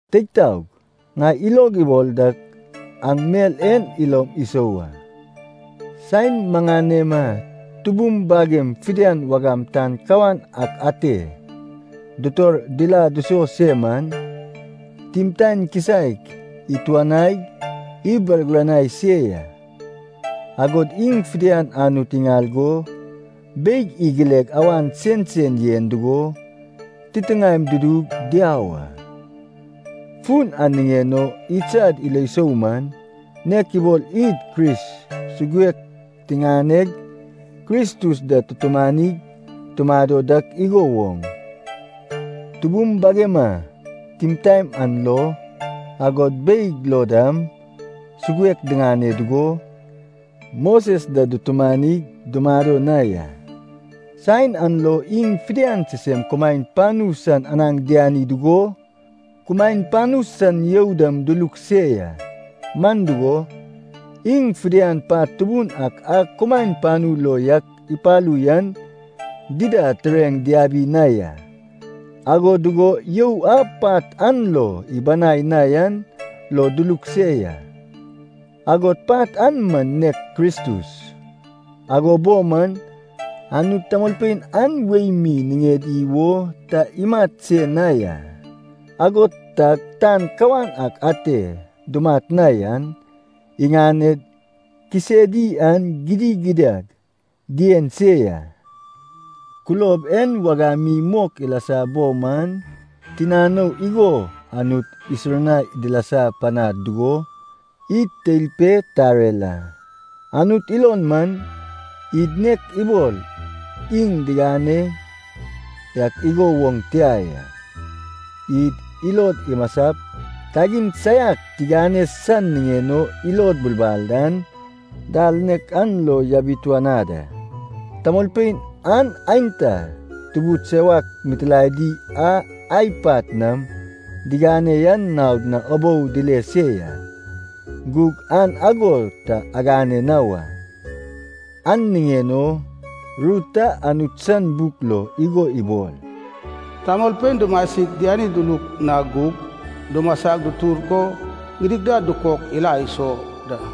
Teig taog, ŋai ilog ibol dak aŋ mel en ilom isou a. Saen maŋanema tubum bagem fidian wagam tan kawan ak ate dutor dila duso se man, timtaen kisaek ituanaig ibargiranai se ya, agod iŋ fidian Anut iŋal go, beig igileg awan sensen yen dugo, titiŋaem dudug diau a. Fun an niŋen o idsad ilo sou man, nek ibol id Kris suguek tiŋaneg Kristus da tutumanig tumado dak igo woŋ, tubum bagema timtaen an lo, agod beig lo dam, suguek diŋane dugo, Moses da dutumanig dumado na ya. Saen an lo iŋ fidian sisem kumaen panu san anaŋ diani dugo, kumaen panu san you dam duluk se ya. Man dugo, iŋ fidian pat tubun ak a kumaen panu lo yak ipalu yan, dida tureŋ diabi na ya. Ago dugo you a pat an lo ibanai na yan lo duluk se ya. Agod pat an man nek Kristus. Ago bo man, Anut tamolpein an wei mi niŋedi wo ta imat se na ya. Ago tag tan kawan ak ate dumat na yan, iŋaned kisedi an gidigidad dien se ya. Kulob en wagam mi mok ilasa bo man, tinanou igo Anut isurnai dilasa panad dugo, id teil pe tarer a. Anut ilon man, id nek ibol iŋ digane yak igo woŋ tia ya, id ilod imasap kagin saiak tigane san niŋen o ilod bulbal an, dal nek an lo yabituanad a. Tamolpein an aenta tubud sewak mitilaedi a ai pat nam digane yan naod na ubou dile se ya, gug aŋ ago ta agane na wa. An niŋen o ru ta Anut san buk lo igo ibol, “Tamolpein dumasig diani duluk na gug, dumasa dutur go gidigidad dukok ila iso da.”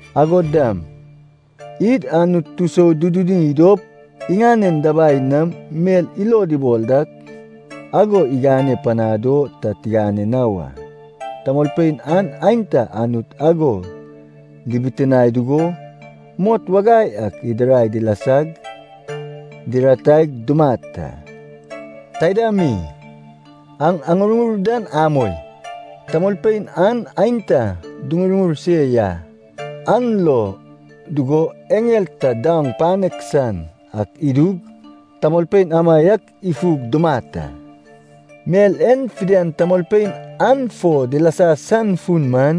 Agod dam, id Anut tusoduduni dop, iŋanen dabai nam mel ilod ibol ak ago igane panad o ta tigane na wa. Tamolpein an aenta Anut ago dibitinae dugo, mot wagai ak idirai dilasag dirataig dumat a. Taida mi, aŋ aŋurŋur dan amoi. Tamolpein an aenta duŋurŋur se ya, an lo dugo eŋel ta daoŋ panek san ak idug tamolpein amaiak ifug dumat a. Mel en fidian tamolpein an fo dilasa san fun man,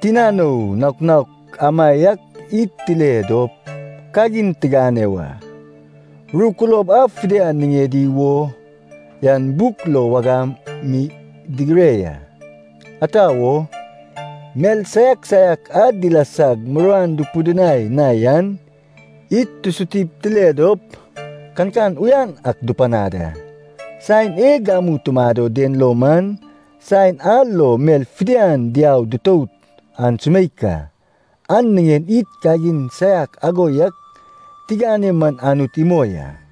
tinanou naok naok amaiak id tile dop kagin tigane wa. Ru kulob a fidian niŋedi wo yan buk lo wagam mi digire ya. Ata wo? Mel saiak saiak a dilasag muruan dupidinai na yan, id tusutip tile dop, kankan uyan ak dupanad a. Saen e gamu tumado den lo man, saen a lo mel fidian diau dutout an sumeik a. An niŋen id kagin saiak ago yak tigane man Anut imoi a.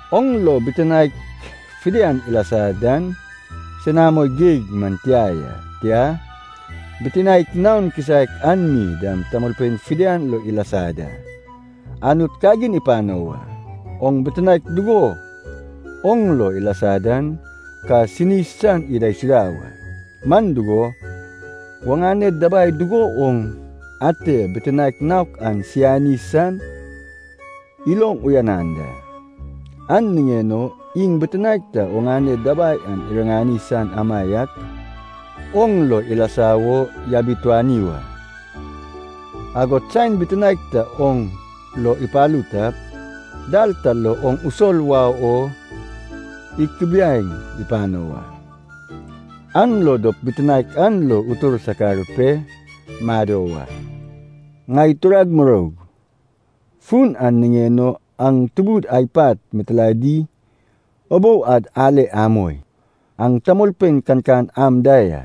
Oŋ lo bitinaek fidian ilasa dan senamo geig man tia ya, tia, bitinaek naon kisaek an mi dam tamolpein fidian lo ilasa da. Anut kagin ipano wa. Oŋ bitinaek dugo oŋ lo ilasa dan ka sini san idaisuda wa. Man dugo, oŋane dabai dugo woŋ ate bitinaek naok an sayani san iloŋ uyanan da, an niŋen o iŋ bitinaek ta oŋane dabai an iriŋani san amaiak oŋ lo ilasa wo yabituani wa. Agod saen bitinaek ta oŋ lo ipalu tap, dal ta lo oŋ usol wau o ikubiai pano wa, an lo dop bitinaek an lo utur sakar pe mado wa. Ŋai turag muroug, fun an niŋen o aŋ tubud ai pat mitilaedi ubou ad ale amoi. Aŋ tamolpein kankan am da ya.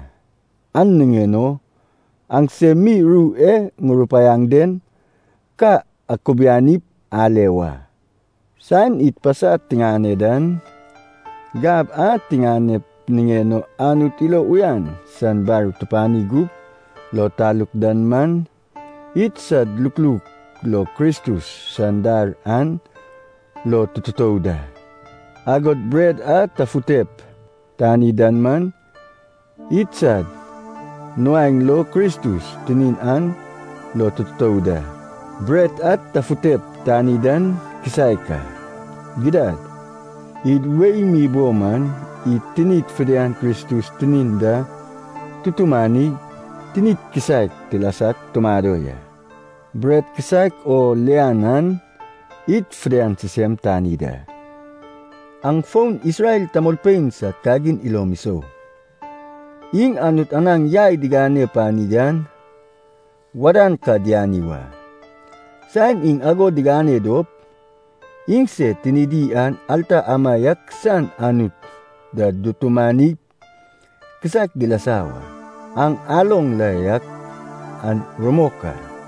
An niŋen o aŋsem mi ru e ŋurupaiaŋ den ka akubianip ale wa. Saen id pasa tiŋane dan, gab a tiŋanep niŋen o Anut ilo uyan san bar tupani gup lo taluk dan man, idsad lukluk lo Kristus san dar an lo tututou da. Agod bret a tafutep tani dan man, idsad nuaeŋ lo Kristus tinin an lo tututou da. Bret a tafutep tani dan kisaek a. Gidad id wei mi bo man, id tinid fidian Kristus tinin da tutumanig tinid kisaek tilasag tumado ya, man dugo, bret kisaek o lian an id fidian sisem tani da. Aŋ fon Isrel tamolpein sad kagin ilom isou. Iŋ Anut anaŋ yai digane pani an wadan ka diani wa. Saen iŋ ago digane dop, iŋsed tinidi an alta amaiak san Anut da dutumanip kisaek dilasa wa. Aŋ aloŋ la yak an rumok a.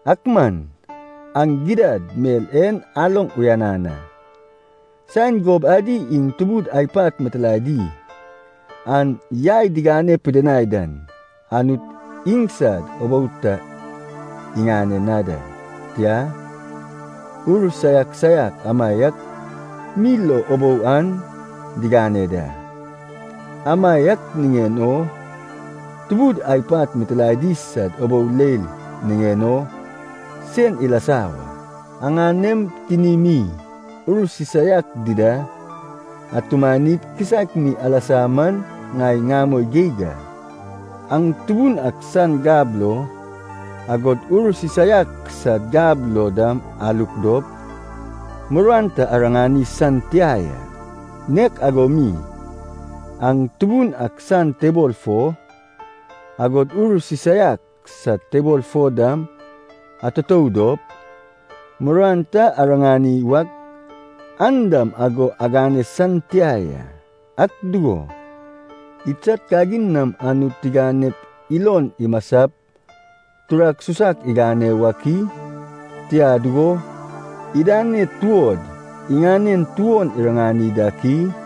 Ak man aŋ gidad mel en aloŋ uyanan a. Saen gob adi iŋ tubud ai pat mitilaedi an yai digane pidinai dan, Anut iŋsad ubou ta iŋane na da, tia, ur saiak saiak amaiak mi ubou an diŋane da. Amaiak niŋen o tubud ai pat mitilaedi sad ubou leil niŋen o sen alasa wa. Aŋanem tinimi ur sisaiak dida atumanip kisaek mi alasa man ŋai ŋamoi geig a. Aŋ Tubun ak san gab lo, agod ur sisaiak sad gab lo dam aluk dop, muruan ta ariŋani san tia ya. Nek ago mi, aŋ Tubun ak san tebol fo, agod ur sisaiak sad tebol fo dam atutou dop, muruan ta ariŋani wak, an dam ago agane san tia ya. Ak dugo, idsad kagin nam Anut tiganep ilon imasap turak susak igane wak i? Tia dugo, idaned tuod iŋanen tuon iriŋani dak i?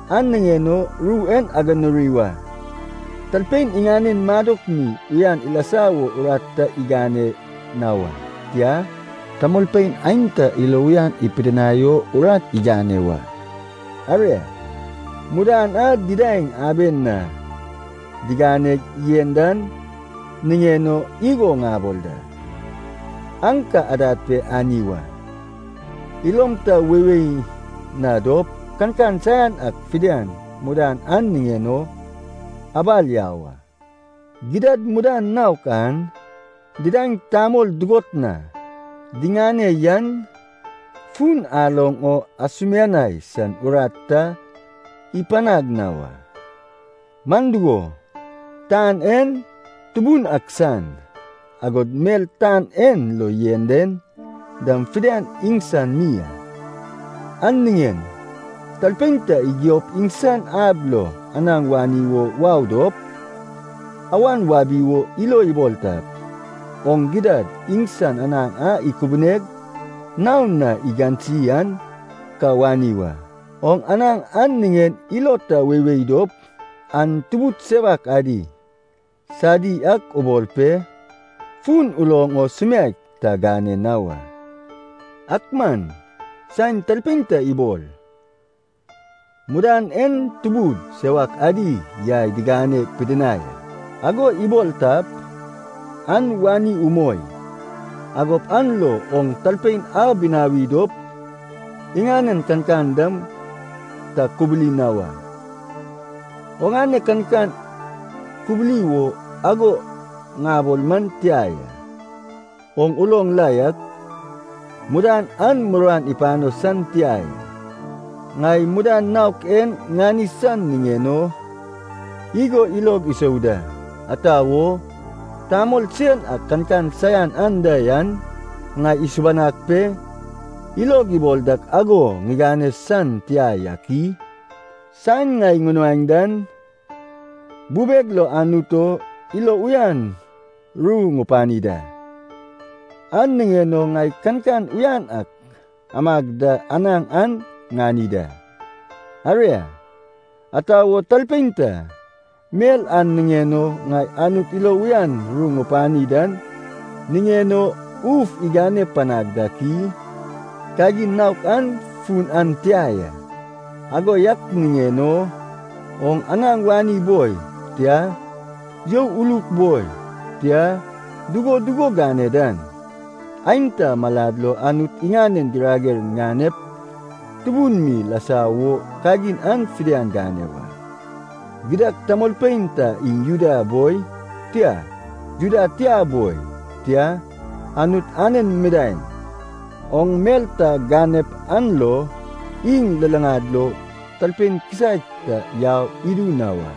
An niŋen o ru en aganuri wa. Talpein iŋanen madok mi uyan ilasa wo urat ta igane na wa. Tia, tamolpein aenta ilo uyan ipidinai o urat igane wa. Aria, mudan a didaeŋ aben na diganeg yen dan niŋen o igo ŋabol da, an ka adad pe ani wa. Ilom ta weiwei na dop kankan saian ak fidian mudan an niŋen o abal yau a. Gidad mudan naok an didaeŋ tamol dugot na diŋane yan, fun aloŋ o asumianai san urat ta ipanaŋ na wa. Man dugo, tan en Tubun ak san, agod mel tan en lo yen den dam fidian iŋsan mi a. An niŋen talpein ta igiop iŋsan ab lo anaŋ wani wo wau dop, awan wabi wo ilo ibol tap, oŋ gidad iŋsan anaŋ a ikubuneg nao na igansi an ka wani wa. Oŋ anaŋ an niŋen ilo ta weiwei dop, an tubud sewak adi sadi ak ubol pe, fun uloŋ o sumiaek ta gane na wa. Ak man saen talpein ta ibol, “Mudan en tubud sewak adi yai digane pidinai a,” ago ibol tap, an wani umoi. Agop an lo oŋ talpein an binawi dop iŋanen kankan dam ta kubuli na wa. Oŋane kankan kubuli wo ago ŋabol man tia ya. Oŋ uloŋ la yak, mudan an muruan ipano san tia ya. Ŋai mudan naok en ŋani san niŋen o igo ilog isou da: ata wo tamol sen ak kankan saian anda yan, ŋai isubanag pe ilog ibol dak ago ŋigane san tia yak i? Saen ŋai ŋunuaeŋ dan, bubeg lo Anut o ilo uyan ru ŋupani da, an niŋen o ŋai kankan uyan ak amag da anaŋ an ŋani da. Aria, ata wo talpein ta, mel a niŋen o ŋai Anut ilo uyan ru ŋupani dan niŋen o uf igane panag dak i? Kagin naok an fun an tia ya. Ago yak niŋen o, oŋ anaŋ wani boi, tia, you uluk boi, tia, dugo dugo gane dan, aenta malad lo Anut iŋanen girager ganep tubun mi ilasa wo kagin an fidian gane wa. Gidad tamolpein ta iŋ Juda boi, tia, Juda tia boi, tia, Anut anen midaeŋ, oŋ mel ta ganep an lo iŋ luluŋad lo talpein kisaek ta yau idu na wa.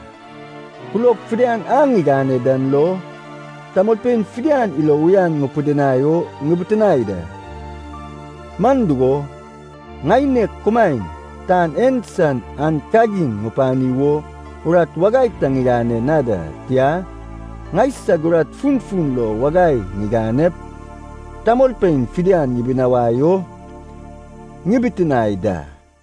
Kulob fidian a ŋigane dan lo, tamolpein fidian ilo uyan ŋupidinai o ŋibitinae da. Man dugo, ŋaineg kumaen tan en san an kagin ŋupani wo urat wagai ta ŋigane na da, tia, ŋaisag urat funfun lo wagai ŋiganep tamolpein fidian ŋibinawai o ŋibitinae da.